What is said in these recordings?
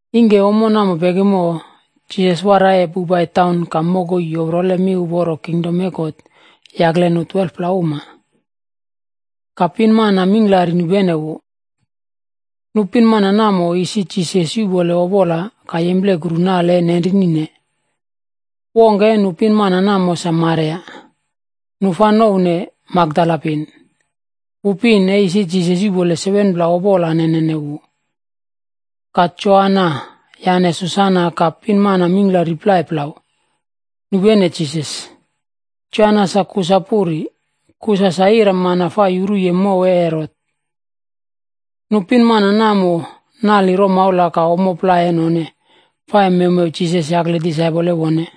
Ingke ommo namo pekimo, Jisas waraiye poipai taun ka mokoi yoprole miuporo kingdom e God yakle nu 12pla uma. Ka pinmana mingklari nupene wu. Nu pinmana namo, isi Jisas yuꞌpoleye opola ka yemplekuru nale e nenrinine. Wongke e nu pinmana namo sa Maria, nu fa nouwne Makdala pin. Wu pin, e isi Jisas yuꞌpoleye 7pla opola nenene wu. Ka Joana yane Susana ka pinmana mingklari plai plau, nupene Jisas. Joana sa Kusa puri, Kusa sa iramana fa yuruye mow e Herot. Nu pinmana namo nali romaula ka ommo plai e none, fa e mewmew Jisas yakle disaipol e wone.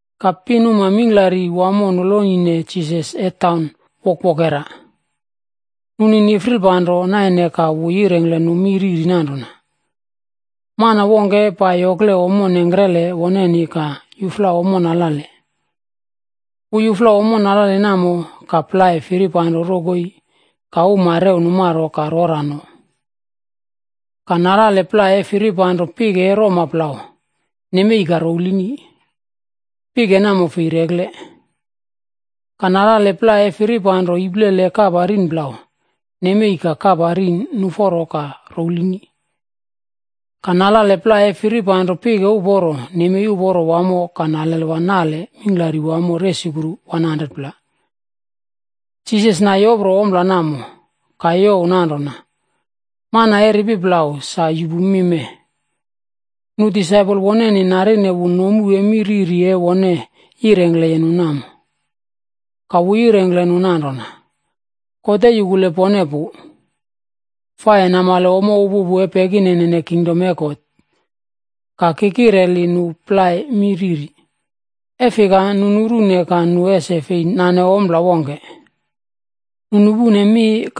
Ka pinuma mingklari wamo nolonine Jisas e taun wokwokera. Nu ni nifrilpanro naine ka wu yirengkle nu mi riri nanrona, “Mana wongke e pai yokle ommo nengkrele woneni ka yufla ommo nalale. Wu yufla ommo nalale namo, ka plai firipanro rokoi ka uma rew numaro ka rora no. Ka nalale plai e firipanro pike e roma plau, nemei ka rowlini, pike namo fei rekle. Ka nalale plai e firipanro iplele e kapa rin plau, nemei ka kapa rin nuforo ka rowlini. Ka nalale plai e firipanro pike uporo, nemei uporo wamo ka nalelwa nale mingklari wamo resukru 100pla.” Jisas na yopro ompla namo, ka youw nanrona, “Mana e ripi plau, sa yupu mi mee.” Nu disaipol woneni narine wu nomu e mi riri e wone yirengkleye nu namo. Ka wu yirengkle nu nanrona, “God e yukule pone pu, fa e namale ommo upupu e pekinenene kingdom e God. Ka ki kireli nu plai mi riri,a e fika, ‘Nu nurune, ka nu ese fei nane ompla wongke. Nu nupune mi,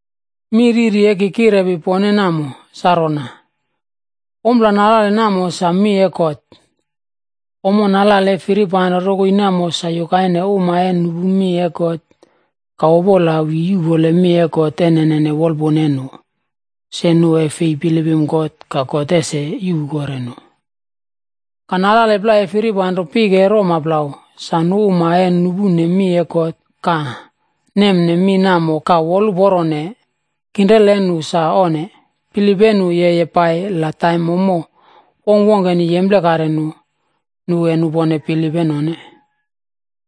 “Mi riri e ki kirepi pone namo, sa rona: Ompla nalale namo, sa mi e God. Ommo nalale e firipanro rokoi namo sa yukaine uma e nupu mi e God, ka Opola wi yuꞌpole mi e God e nene wolpuna e nu, se nu e fei bilipim God ka God ese yuꞌpu kore nu. Ka nalale plai e firipanro pike e roma plau, sa nu uma e nupune mi e God ka nemne mi namo ka woluporone, kinrela e nu sa onne, bilip e nu yeye pai la taim ommo wongkwongkeni yemplekare nu, nu e nupone bilip e none.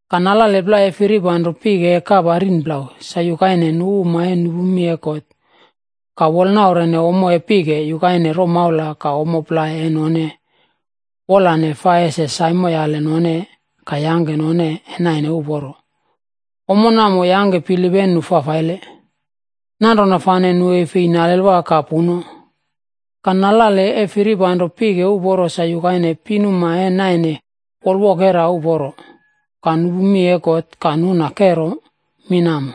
Ka nalale plai e firipanro pike e kapa rin plau sa yukaine nu uma e nupu mi e God, ka wolnaurene ommo e pike, yukaine romaula ka ommo plai e none wolane fa ese saimoyale none ka yangke none e naine uporo, ommo namo yangke bilip e nu fafaile. Nanrona fane nu e fei nalelwa ka puno. Ka, nalale e firipanro pike uporo sa yukaine pinuma e naine wolwokera uporo, ka nupu mi e God ka nuna kero mi namo.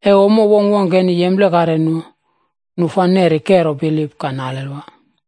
E ommo wongkwongkeni yemplekare nu, nu fa neri kero bilip ka nalelwa.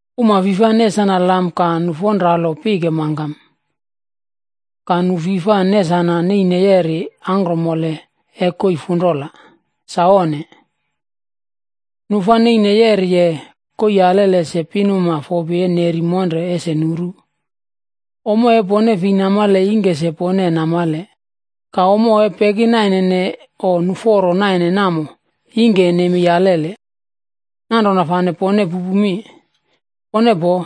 “Uma fi fa nesana lam ka nufonralo pike mangkam, ka nu fi fa nesana neine yeri angkromole e koii funrola. Sa onne! Nu fa neine yeriye koii alele se nu pinuma fopi e neri monre ese nuru. Ommo e pone fei namale ingke se pone e namale, ka ommo e pekinaine o nuforo naine namo ingke e nemei alele. Nanrona fane e pone pupu mi, pone poo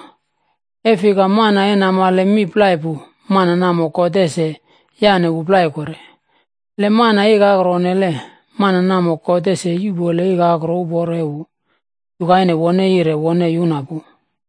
e fika mana e namale mi plai pu, mana namo God ese yaꞌne wu plai kore. Le mana ikakro onnele, mana namo God ese yuꞌpole ikakro uporo e wu, yukaine wone yire wone yuna pu.”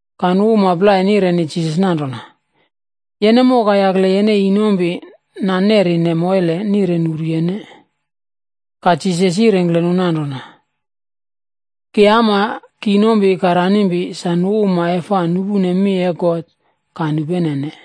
Ka nu uma plai nireni Jisas nanrona, “Yene moka yakle yene inompi nanerine moile nire nuru yene.” Ka Jisas yirengkle nu nanrona, “Ki ama, ki inompi ka ranimpi, sa nu uma e fa nupune mi e God ka nupenene.”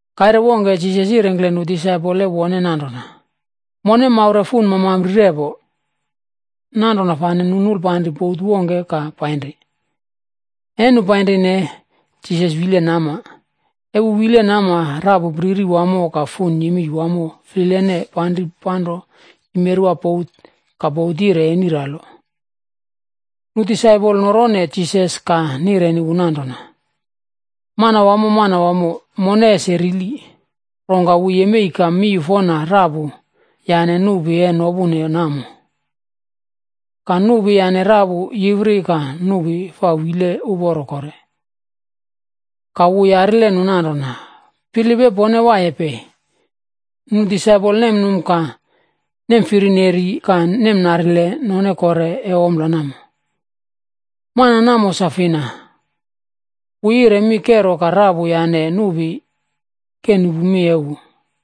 Kaire wongke Jisas yirengkle nu disaipol e wone nanrona, “Mone maure fun mamampri repo.” Nanrona fane nu nulpanri bot wongke ka painri. E nu painrine, Jisas wile nama. E wu wileye nama, rapu priri wamo ka fun yemei wamo flilene panri panro yimerwa bot ka bot yire eniralo. Nu disaipol norone Jisas ka nireni wu nanrona, “Manwamo, Manwamo, mone ese rili!” Rongka wu yemei ka yenre rapu yane nupi e nopune namo. Ka nupi yane rapu yiwri ka nupi fa wile uporo kore. Ka wu yarile nu nanrona, “Bilip e pone waiye pei?” Nu disaipol nemnum ka nemfirineri ka nemnarile none kore e ompla namo, “Mana namo sa fina, wu yire mi kero ka rapu yane nupi ke nupu mi e wu.”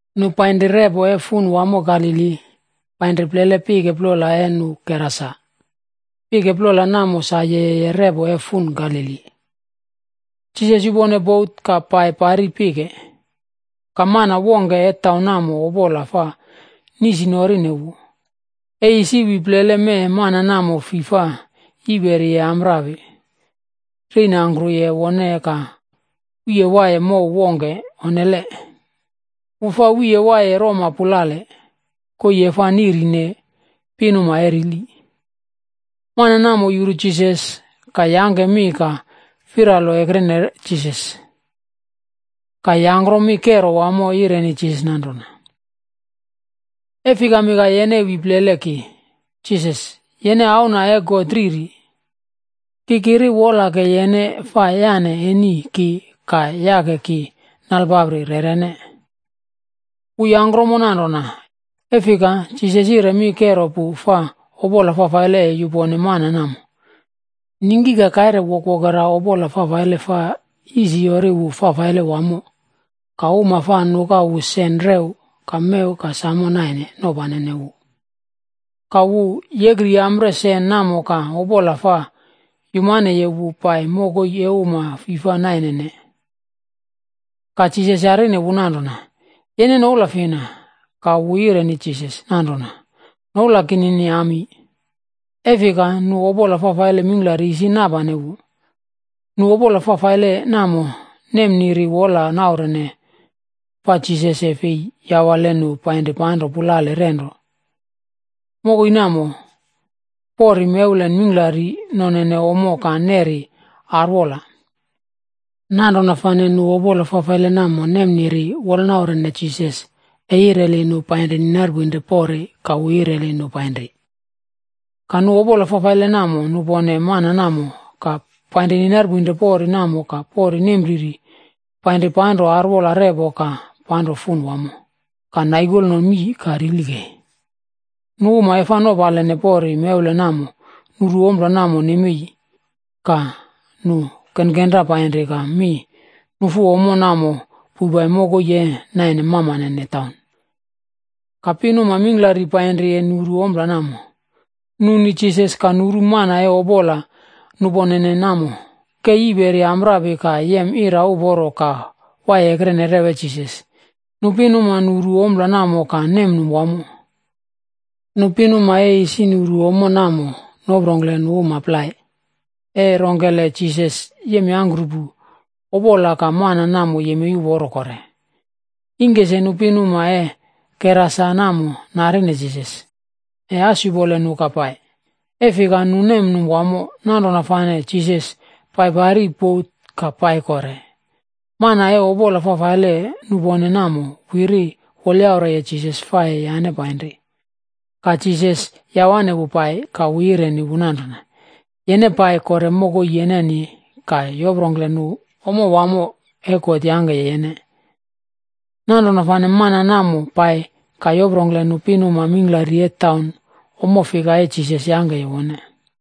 Nu painri repo e fun wamo Galili, painri plele pike plola e nu Gerasa. Pike plola namo sa yeye repo e fun Galili. Jisas yupone bot ka pai pari pike, ka mana wongke e taun namo, opola fa nisinorine wu. E isi wi plele mee mana namo fi fa yiperiye amprapi reinangkruye wone, ka wiye waiye mow wongke onnele. Wu fa wiye waiye roma pulale, koii e fa niꞌrine pinuma e rili. Mana namo yuru Jisas, ka yangke mi ka firalo ekrene Jisas. Ka yangkrom mi kero wamo yireni Jisas nanrona, “E fikami ka yene wi plele ki, Jisas, yene Auna e God Riri! Ki kiri wola ke yene fa yane eni ki ka yangke ki nalpapri rerene.” Wu yangkromo nanrona, e fika, Jisas yire mi kero pu fa opola fafaile e yupone mana namo. Ningki ka kaire wokwokera opola fafaile fa yisiyori wu fafaile wamo, ka uma fa nuka wu sen rew ka mew ka samo naine nopanene wu. Ka wu yekriyampreye sen namo ka opola fa yumaneye wu pai mokoi e uma fi fa nainene. Ka Jisas yarine wu nanrona, “Yene noula fina?” Ka wu yireni Jisas nanrona, “Noula kinini Ami.” E fika nu opola fafaile mingklari isi napane wu. Nu opola fafaile namo nemniri wola naurene fa Jisas e fei yawale nu painri panro pulale renro. Mokoi namo, pori mewlen mingklari nonene ommo ka nerine arwola. Nanrona fane nu opola fafaile namo nemniri wolanaurene Jisas e yireli nu painri ninarpoinre pori, ka wu yireli nu painri. Ka nu opola fafaile namo nupone mana namo, ka painri ninarpoinre pori namo ka pori nempriri painri panro arwola repo ka panro fun wamo, ka naikolno mii ka rili kei. Nu uma e fa nopaline pori mewlen namo nuru ompla namo nemei, ka nu kenkenra painri ka mi nufu ommo namo poipai mokoi e naine mamanene taun. Ka pinuma mingklari painri e nuru ompla namo. Nu ni Jisas, ka nuru mana e opola nuponene namo ke yiperi amprapi ka yem ira uporo ka waiye ekrene rew e Jisas. Nu pinuma nuru ommo namo ka nemnum wamo. Nu pinuma e isi nuru ommo namo noprongkle nu uma plai, e rongkele Jisas yemyangkrupu opola ka mana namo yemei uporo kore. Ingke se nu pinuma e Gerasa namo narine Jisas, e as yupole nu ka pai, e fika nu nemnum wamo. Nanrona fane Jisas pai pari bot ka pai kore. Mana e opola fafaile nupone namo wiri wolyaureye Jisas fa e yane painri, ka Jisas yawane wu pai. Ka wu yireni wu nanrona, “Yene pai kore mokoi yeneni ka yoprongkle nu ommo wamo e God yangke yene.” Nanrona fane mana namo pai ka yoprongkle nu pinuma mingklari e taun ommo fika e Jisas yangkeye wone.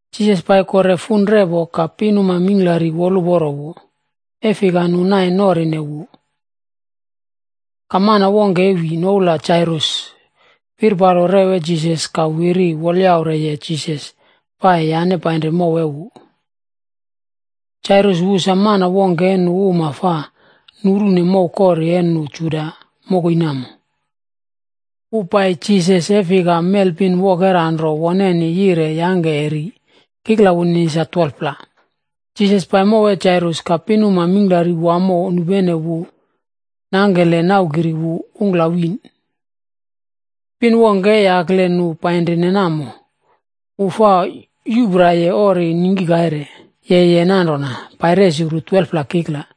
Jisas pai kore fun repo ka pinuma mingklari woluporo wu, e fika nu nai norine wu. Ka mana wongke e wi, noula Jairus, firpalo rew e Jisas ka wiri wolyaureye Jisas fa e yane painri mow e wu. Jairus wu sa mana wongke e nu uma fa nurune mow kori e nu Juda mokoi namo. Wu pai Jisas e fika mel pin wokera nro woneni yire yangke e ri, kikla wunini sa 12-pla. Jisas pai mow e Jairus, ka pinuma mingklari wamo nupene wu nangke le naukiri wu ungkla wiꞌn. Pin wongke e yakle nu painri namo. Wu fa yupraiye ori ningki kaire, yeye nanrona pai resukru 12-pla kikla,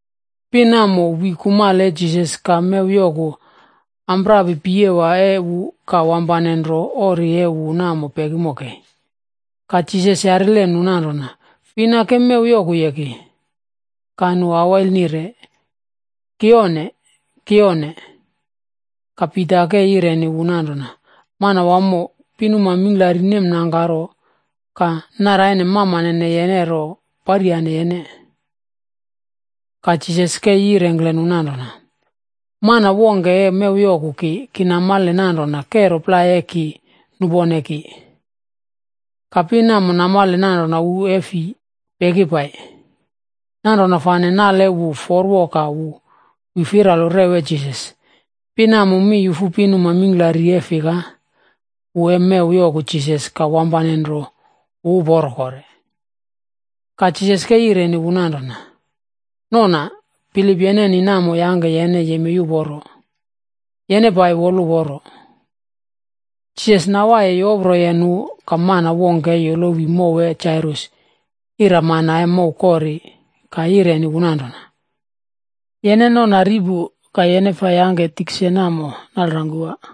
Pin namo wi kumale e Jisas ka mew yoku amprapi piyewa e wu ka wampane nro ori e wu namo pekimo kei. Ka Jisas yarile nu nanrona, “Fina ke mew yokuye ki?” Ka nu awail nire, “Ki onne. Ki onne.” Ka Pita ke yireni wu nanrona, “Manwamo, pinuma mingklari nemnangkaro ka naraine mamanene yene ro paryane yene.” Ka Jisas ke yirengkle nu nanrona, “Mana wongke e mew yoku ki, ki namale nanrona kero plai e ki nupone ki.” Ka pin namo namale nanrona wu e fi peki pai, nanrona fane nale e wu forwo ka wu wi firalo rew e Jisas. Pin namo mi yufu pinuma mingklari e fika wu e mew yoku Jisas ka wampane nro wu uporo kore. Ka Jisas ke yireni wu nanrona, “Nona, bilip yeneni namo yangke yene yemei uporo. Yene pai woluporo.” Jisas nawaiye yoproye nu ka mana wongke e yolowi mow e Jairus iramana e mow kori, ka yireni wu nanrona, “Yene nona ri pu, ka yene fa yangke tikse namo nalrangkuwa.”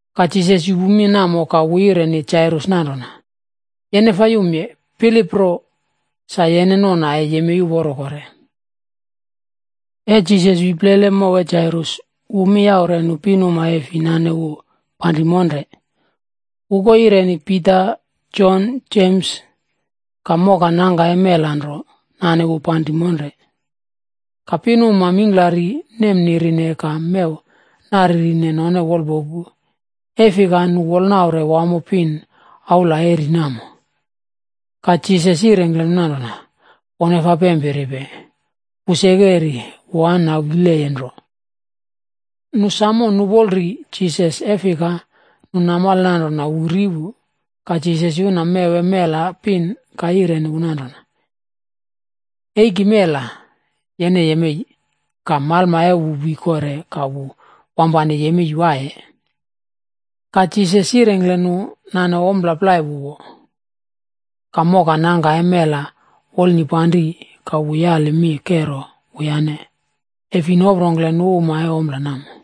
Ka Jisas yupu mi namo ka wu yireni Jairus nanrona, “Yene fa yumye, bilip nro, sa yene nona e yemei uporo kore.” E Jisas wi plele mow e Jairus, wu mi yaure nu pinuma e fi nane wu panri monre. Wu ko yireni Pita, Jon, Jems, ka mokanangka e mela nro nane wu panri monre. Ka pinuma mingklari nemnirine ka mew naririne none wolpoku, e fika nu wolnaure wamo pin aula e ri namo. Ka Jisas yirengkle nu nanrona, “Pone fa pempiripe, wu seke ri, wu an nawileye nro.” Nu sam nupol ri Jisas e fika nu namale nanrona wu ri pu. Ka Jisas yuna mew e mel pin ka yireni wu nanrona, “Eiki mela, yene yemei!” Ka malma e wu wi kore ka wu wampane yemei waiye. Ka Jisas yirengkle nu nane ompla plai wu wo. Ka mokanangka e mela wolnipanri, ka wu yali mi kero wuyane, e fi noprongkle nu uma e ompla namo.